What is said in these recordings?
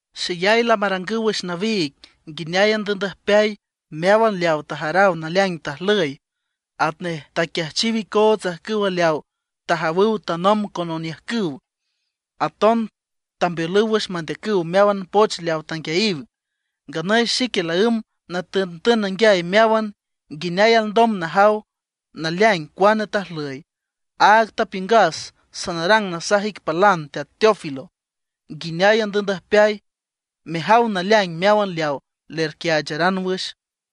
Xeyay lamarangüw wüx nawiig nguineay andüübndüjpeay meáwan leawa tajaraw naleaing tajlüy, atnej taquiajchiw icoots ajcüw leawa tajawüw tanomb con oniüjcüw; aton tambeolüw wüx mandeacüw meáwan poch leaw tanguiayiw. Nganüy xique laǘmb natüntün nanguiay meáwan, nguineay alndom najaw naleaing cuane tajlüy. Áag tapiüngas sanarang nasaj ic palan Teat Teófilo, nguineay andüübndüjpeay, mejaw naleaing meáwan leaw lerquiaacharan wüx.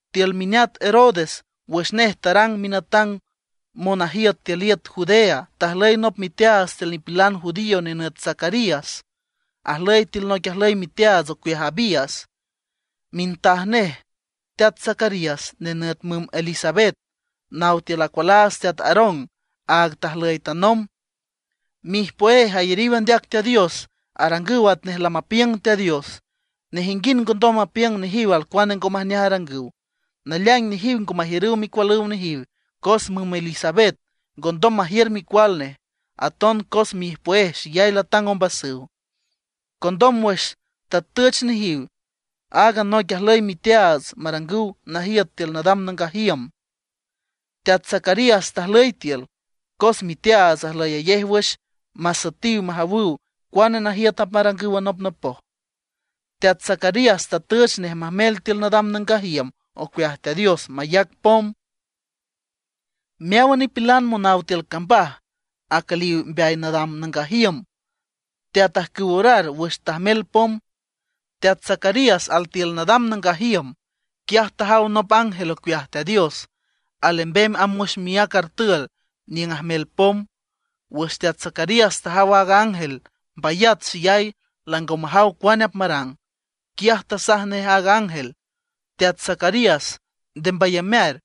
Tiül mineat Herodes wüx nej tarang minatang monajiüt tiül iüt Judea, tajlüy nop miteaats tiül nipilan judío nenüt Zacarías, ajlüy tiül noic ajlüy miteaats ocueaj Abías. Mintaj nej teat Zacarías nenüt müm Elisabet, naw tiül acualaats teat Aarón, áag tajlüy tanomb. Miijpüéj ayariw andeac Teat Dios, arangüw atnej lamapiüng Teat Dios. Nejinguind ngondom mapiüng nejiw alcuane ngo majneaj arangüw. Naleaing nejiw ngo majiürüw micualüw nejiw cos müm Elisabet ngondom majiür micual nej; aton cos miijpüéj xeyay latang ombasüw. Condom wüx tatüch nejiw aaga noic ajlüy miteaats marangüw najiüt tiül nadam nangaj iüm, teat Zacarías tajlüy tiül. Cos miteaats ajlüyayej wüx masüetiw majawüw cuane najiüt apmarangüw anopnopoj. Teat Zacarías tatüch nej majmel tiül nadam nangaj iüm ocueaj Teat Dios mayac pom. Meáwan nipilan monaw tiül cambaj acülíwan mbeay nadam nangaj iüm teatajcüw orar wüx teajmel pom. Teat Zacarías altiül nadam nangaj iüm, quiaj tajaw nop ángel ocueaj Teat Dios alembem amb wüx miác artül niüng ajmel pom. Wüx teat Zacarías tajaw aaga ángel, mbayat xeyay, lango majaw cuane apmarang. Quiaj tasaj nej a ángel: ―Teat Zacarías, nde mbayamear,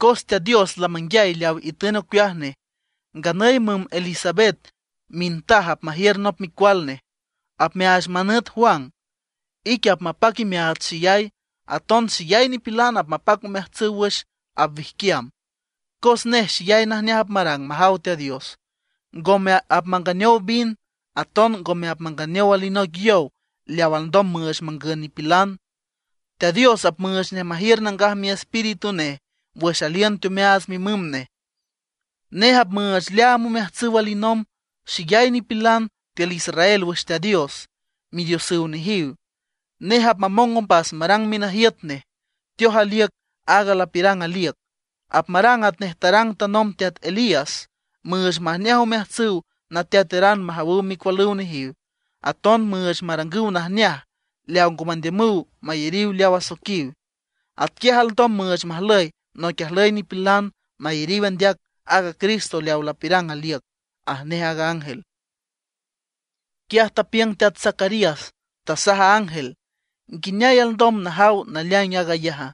cos Teat Dios lamanguiay leaw itün ocueaj nej. Nganüy müm Elisabet mintaj apmajiür nop micual nej. Apmeaach manüt Juan. Ique apmapac imeaats xeyay. Aton xeyay nipilan apmapac omeajtsüw wüx apwijquiam, cos nej xeyay najneaj apmarang majaw Teat Dios. Ngome apmanganeow vin, aton ngome apmanganeow alinoic yow leaw alndom müüch mangün nipilan. Teat Dios apmüüch nej majiür Nangaj Miespíritu Nej wüx aliün teomeaats mimüm nej. Nej apmüüch leaam omeajtsüw alinomb xeyay nipilan tiül israel wüx Teat Dios, midiosüw nejiw. Nej apmamong ombas marang minajiüt nej, teoj aliüc aaga lapiürang aliüc. Apmarang atnej tarang tanomb teat Elías, müüch majneaj omeajtsüw nateateran majawüw micualüw nejiw. Aton müüch marangüw najneaj leaw ngo mandiümüw mayariw leaw asoiquiw. Atquiaj alndom müüch majlüy noic ajlüy nipilan mayariw andeac aaga Cristo leaw lapiürang aliüc ―aj nej aaga ángel. Quiaj tapiüng teat Zacarías, tasaj a ángel: ―¿Nguineay alndom najaw naleaing aag ayaja?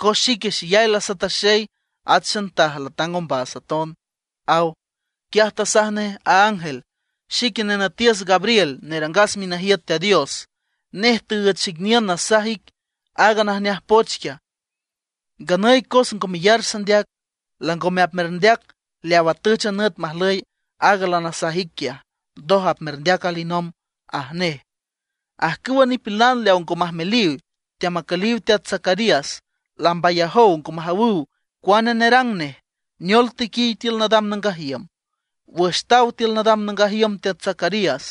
Cos xique xeyay lasataxey, at xantaj latang ombas aton ―aw. Quiaj tasaj nej a ángel: ―Xique nenütiüs Gabriel nerangas minajiüt Teat Dios. Nej tüüch xic niün nasaj ic aaga najneaj poch quiaj. Nganüy cos ngo meyar sandeac, langome apmerndeac leaw atüch a nüt majlüy aaga lanasaj ic quiaj, ndoj apmerndeac alinomb ―aj nej. Ajcüwa nipilan leaw ngo majmeliw, teamacüliw teat Zacarías, lambayajow ngo majawüw cua nerang nej, neol tequiy tiül nadam nangaj iüm. Wüx taw tiül nadam nangaj iüm teat Zacarías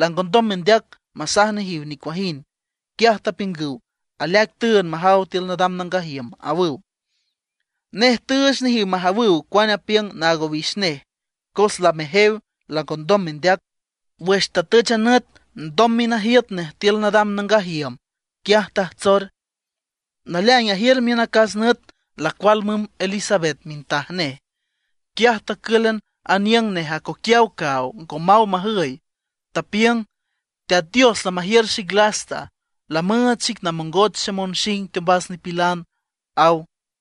langondom mendeac masaj nejiw nicuajind. Quiaj tapiüngüw: ―Aleaic tüünd majaw tiül nadam nangaj iüm ―awüw. Nej tüüch nejiw majawüw cuane apiüng naag owix nej, cos lamejew, langondom mendeac. Wüx tatüch a nüt ndom minajiüt nej tiül nadam nangaj iüm, quiaj tajtsor. Naleaing ajiür miün acas nüt lacual müm Elisabet mintaj nej. Quiaj tacǘlan aniüng nej acoquiaw caaw, ngo maw majüy. Tapiüng: “Teat Dios lamajiür xic lasta, lamüüch xic namongoch xemonxing teombas nipilan”, aw.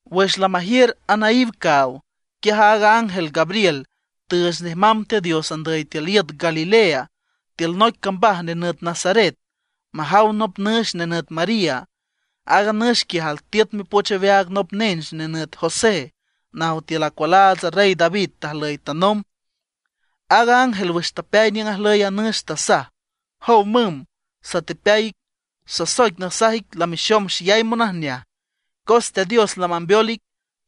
Wüx lamajiür anaíw caaw, quiaj aaga ángel Gabriel tüüch nej mamb Teat Dios andüy tiül iüt Galilea, tiül noic cambaj nenüt Nazaret, majaw nop nüx nenüt María. Aaga nüx quiaj altiüt mipoch aweaag nop nench nenüt José, naw tiül acualaats a Rey David tajlüy tanomb. Aaga ángel wüx tapeay niüng ajlüy a nüx, tasaj: ―¡Jow müm, satepeay ic! Sasoic nasaj ic lamexom xeyay monajneaj, cos Teat Dios lamambeol ic.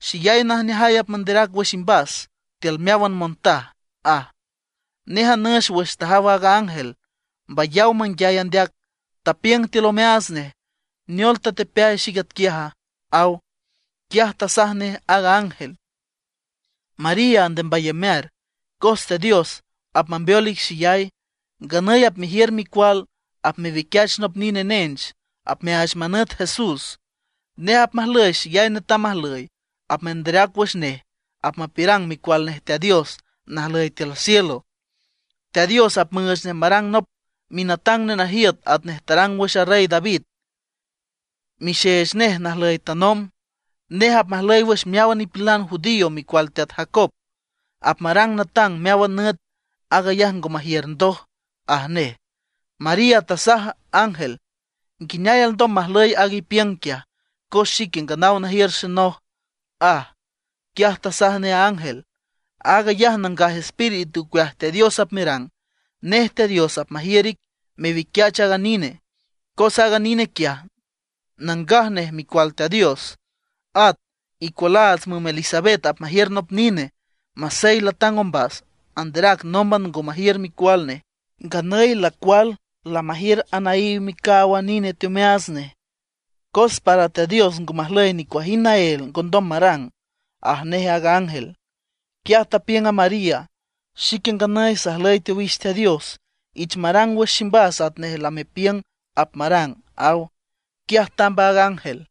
Xeyay najneajay apmanderac wüx imbas tiül meáwan montaj ―aj. Nej a nüx wüx tajaw aaga ángel, mbayaw manguiay andeac, tapiüng tiül omeaats nej: “¿Neol tatepeay xic atquiaja?” aw. Quiaj tasaj nej aaga ángel: ―María, nde mbayamear, cos Teat Dios apmambeol ic xeyay. Nganüy apmejiür micual, apmewiquiach nop nine nench, apmeaach manüt JESS. Nej apmajlüy xeyay netam ajlüy. Apmanderac wüx nej apmapiürang micual nej Teat Dios najlüy tiül cielo. Teat Dios apmüüch nej marang nop minatang nenajiüt atnej tarang wüx a Rey David, mixeech nej najlüy tanomb. Nej apmajlüy wüx meáwan nipilan judío micual teat Jacob, apmarang natang meáwan nüt, aag ayaj ngo majiür ndoj ―aj nej. María tasaj a ángel: ―¿Nguineay alndom majlüy aaga ipiüng quiaja, cos xique nganaw najiür xenoj? ―aj. Quiaj tasaj nej a ángel: ―Aag ayaj Nangaj Espíritu ocueaj Teat Dios apmerang. Nej Teat Dios apmajiür ic mewiquiach aaga nine, cos aaga nine quiaj nangaj nej Micual Teat Dios. At icualaats müm Elisabet apmajiür nop nine. Masey xeyay latang ombas, anderac nómban ngondom majiür micual nej. Nganüy lacual lamajiür anaíw micaaw a nine teomeaats nej. Cos para Teat Dios ngo majlüy nicuajind naél ngondom marang ―aj nej a ángel. Quiaj tapiüng a María: ―Xique nganüy sajlüy tiül owix Teat Dios, ich marang wüx ximbas atnej lamepiüng apmarang ―aw. Quiaj tamb a ángel.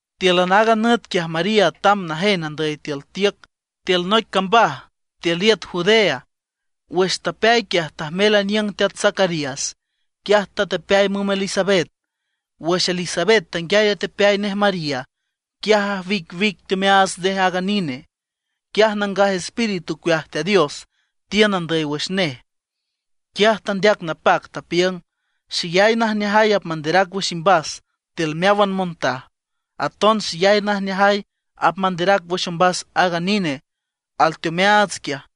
Tíülan aaga nüt quiaj María tamb najen andüy tiül tiüc tiül noic cambaj tiül iüt Judea. Wüx tapeay quiaj tajmel aniüng teat Zacarías, quiaj tatepeay müm Elisabet. Wüx Elisabet tanguiay atepeay nej María, quiaj ajwicwic teomeaats nej aaga nine. Quiaj Nangaj Espíritu ocueaj Teat Dios tiün andüy wüx nej. Quiaj tandeac napac, tapiüng: ―Xeyay najneajay apmanderac wüx imbas tiül meáwan montaj, aton xeyay najneajay apmanderac wüx ombas aaga nine alteomeaats quiaj.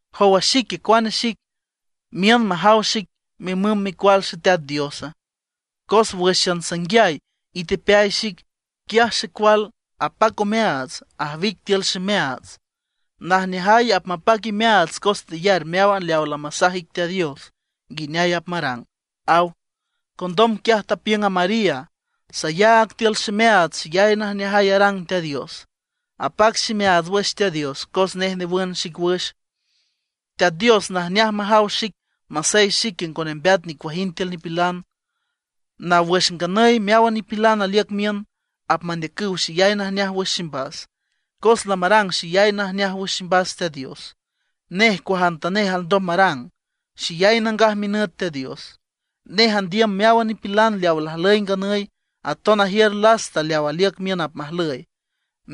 ¿Jow a xique, cuane xic, miün majaw xic mimüm Micual Xeteat Diosa? Cos wǘxan sanguiay itepeay xic, quiaj xecual apac omeaats, ajwic tiül ximeaats. Najneajay apmapac imeaats cos teyar meáwan leaw lamasaj ic Teat Dios nguineay apmarang ―aw. Condom quiaj tapiüng a María: Sayaag tiül ximeaats xeyay najneajay arang Teat Dios. Apac ximeaats wüx Teat Dios, cos nej newün xic wüx. Teat Dios najneaj majaw xic masey xique ngo nembeat nicuajind tiül nipilan. Naw wüx nganüy meáwan nipilan aliüc miün, apmandeacüw xeyay najneaj wüx ximbas. Cos lamarang xeyay najneaj wüx ximbas Teat Dios; nej cuajantanej alndom marang, Xeyay nangaj minüt Teat Dios. Nej andiüm meáwan nipilan leawa lajlüy nganüy, aton ajiür lasta leaw aliüc miün apmajlüy,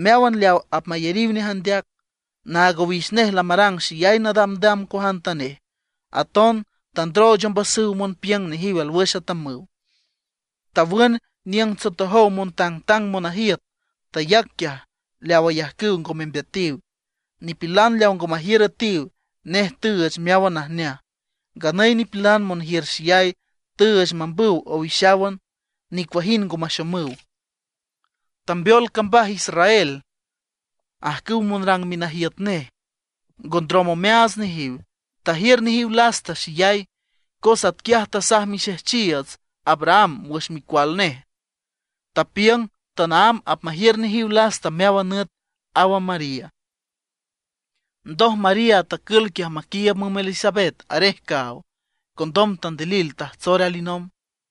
meáwan leaw apmayariw nej andeac. Naag owix nej lamarang xeyay nadamdam cuajantanej, aton tandrooch ombasüw monpiüng nejiw alwüx atamüw. Tawün niüng tsotojow montangtang monajiüt, tayac quiaj leaw ayajcüw ngo membeatiw. Nipilan leawa ngo majiür üetiw, nej tüüch meáwan najneaj; nganüy nipilan monjiür xeyay, tüüch mambüw owixáwan, nicuajind ngo maxomüw. Tambeol cambaj Israel, ajcüw monrang minajiüt nej; ngo ndrom omeaats nejiw, tajiür nejiw lasta xeyay, cos atquiaj tasaj mixejchiiüts Abraham wüx micual micual nej; tapiüng tanaámb apmajiür nejiw lasta meáwan nüt ―aw a María. Ndoj María tacül quiaj maquiiüb müm Elisabet arej caaw, condom tandilil tajtsor alinomb.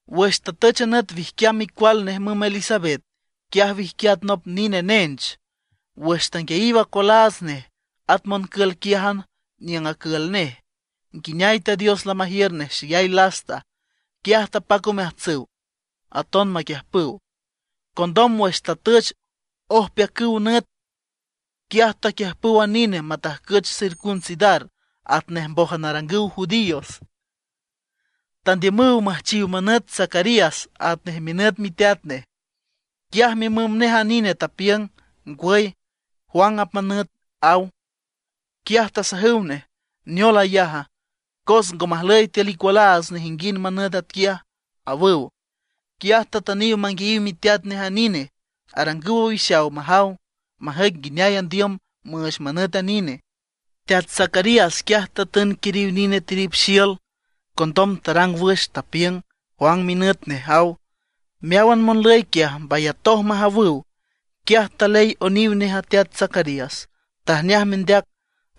Wüx tatüch a nüt wijquiam micual nej müm Elisabet, quiaj wijquiat nop nine nench. Wüx tanguiayiw acualaats nej, at moncül quiájan niüng acül nej, nguineay Teat Dios lamajiür nej xeyay lasta, quiaj tapac omeajtsüw aton maquiüjpüw. Condom wüx tatüch ojpeacüw nüt, quiaj taquiüjpüw a nine matajcüch circuncidar atnej mbójan arangüw judíos. Tandiümüw müjchiw manüt Zacarías atnej minüt miteat nej. Quiaj mimüm nej a nine tapiüng: ―Ngwüy, Juan apmanüt ―aw. Quiaj tasajüw nej: ―¿Neol ayaja? Cos ngo majlüy tiül icualaats nejinguind manüt atquiaj ―awüw. Quiaj tatüniw manguiayiw miteat a nine, arangüw owixaw majaw, majüic nguineay andiüm müüch manüt a nine. Teat Zacarías quiaj tatün quiriw nine tirip xiül, condom tarang wüx, tapiüng: “Juan minüt nej”, aw. Meáwan monlüy quiaj mbayatoj majawüw. Quiaj taley oniw nej a teat Zacarías, tajneaj mendeac,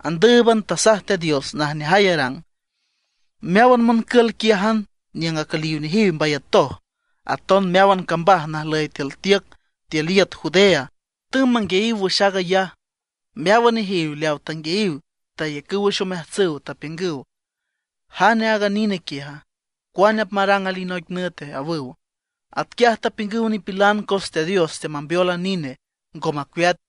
andǘüban tasaj Teat Dios najneajay arang. Meáwan moncül quiájan niüng acüliw nejiw mbayatoj, aton meáwan cambaj najlüy tiül tiüc tiül iüt Judea tümb manguiayiw wüx aag ayaj. Meáwan nejiw leawa tanguiayiw tayacüw wüx omeajtsüw, tapiüngüw: ―¿Jane aaga nine quiaja? ¿Cuane apmarang alinoic nüte? ―awüw. Atquiaj tapiüngüw nipilan cos Teat Dios teamambeol a nine, ngo macueat.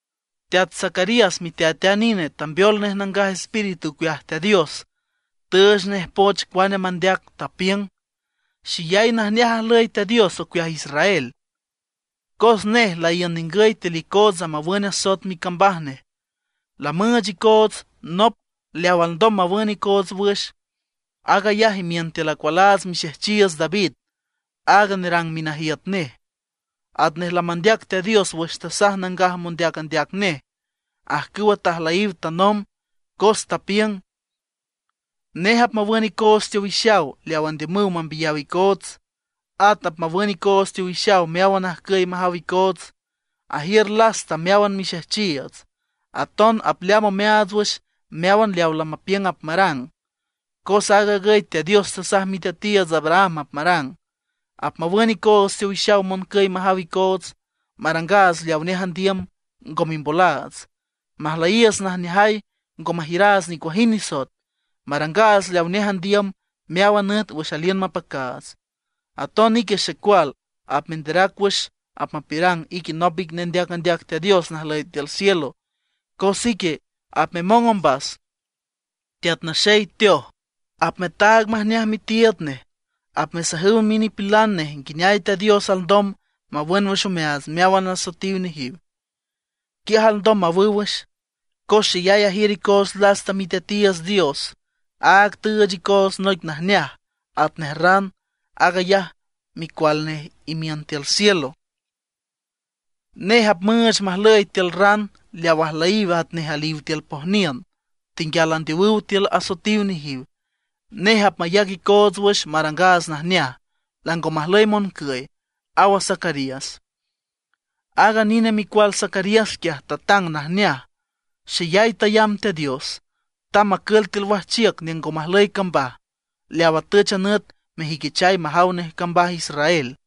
Teat Zacarías miteat a nine, tambeol nej Nangaj Espíritu ocueaj Teat Dios, tüüch nej poch cuane mandeac, tapiüng: Xeyay najneaj ajlüy Teat Dios ocueaj Israel, cos nej laíün ningüy tiül icootsa mawün asoet micambaj nej. Lamüüch icoots nop leaw alndom mawün icoots wüx, aag ayaj imiün tiül acualaats mixejchiiüts David, aaga nerang minajiüt nej. Atnej lamandeac Teat Dios wüx tasaj nangaj mondeac andeac nej, ajcüwa tajlüyiw tanomb, cos tapiüng: Nej apmawün icoots teowixaw leaw andiümüw mambiyaw icoots, at apmawün icoots teowixaw meáwan ajcüy majaw icoots. Ajiür lasta meáwan mixejchiiüts, aton apleaam omeaats wüx meáwan leawa lamapiüng apmarang. Cos aag agüy Teat Dios tasaj miteatiiüts Abraham apmarang: Apmawün icoots teowixaw moncüy majaw icoots, marangaats leawa nej andiüm, ngo mimbolaats. Majlüyiiüts najneajay, ngo majiüraats nicuajind nisoet, marangaats leawa nej andiüm meáwan nüt wüx aliün mapacaats. Aton ique xecual, apmenderac wüx apmapiürang ique nop ic nendeac andeac Teat Dios najlüy tiül cielo, cos ique apmemong ombas, Teat Naxey teoj, apmetaag majneaj mitiiüd nej. Apmesajüw minipilan nej nguineay Teat Dios alndom mawün wüx omeaats meáwan asoetiw nejiw, quiaj alndom mawüw wüx. Cos xeyay ajiür icoots lasta Miteatiiüts Dios, áag tüüch icoots noic najneaj atnej ran, aag ayaj Micual nej imiün tiül cielo. Nej apmüüch majlüyiw tiül ran leaw ajlüyiw atnej aliw tiül pojniün, tenguial andeowüw tiül asoetiw nejiw. Nej apmayac icoots wüx marangaats najneaj, lango majlüy moncüy, aw a Zacarías. Aaga nine micual Zacarías quiaj tatang najneaj, xeyay tayamb Teat Dios. Tamb macül tiül wajchiüc niüng ngo majlüy cambaj, leaw atüch a nüt mejüiquichay majaw nej cambaj israel.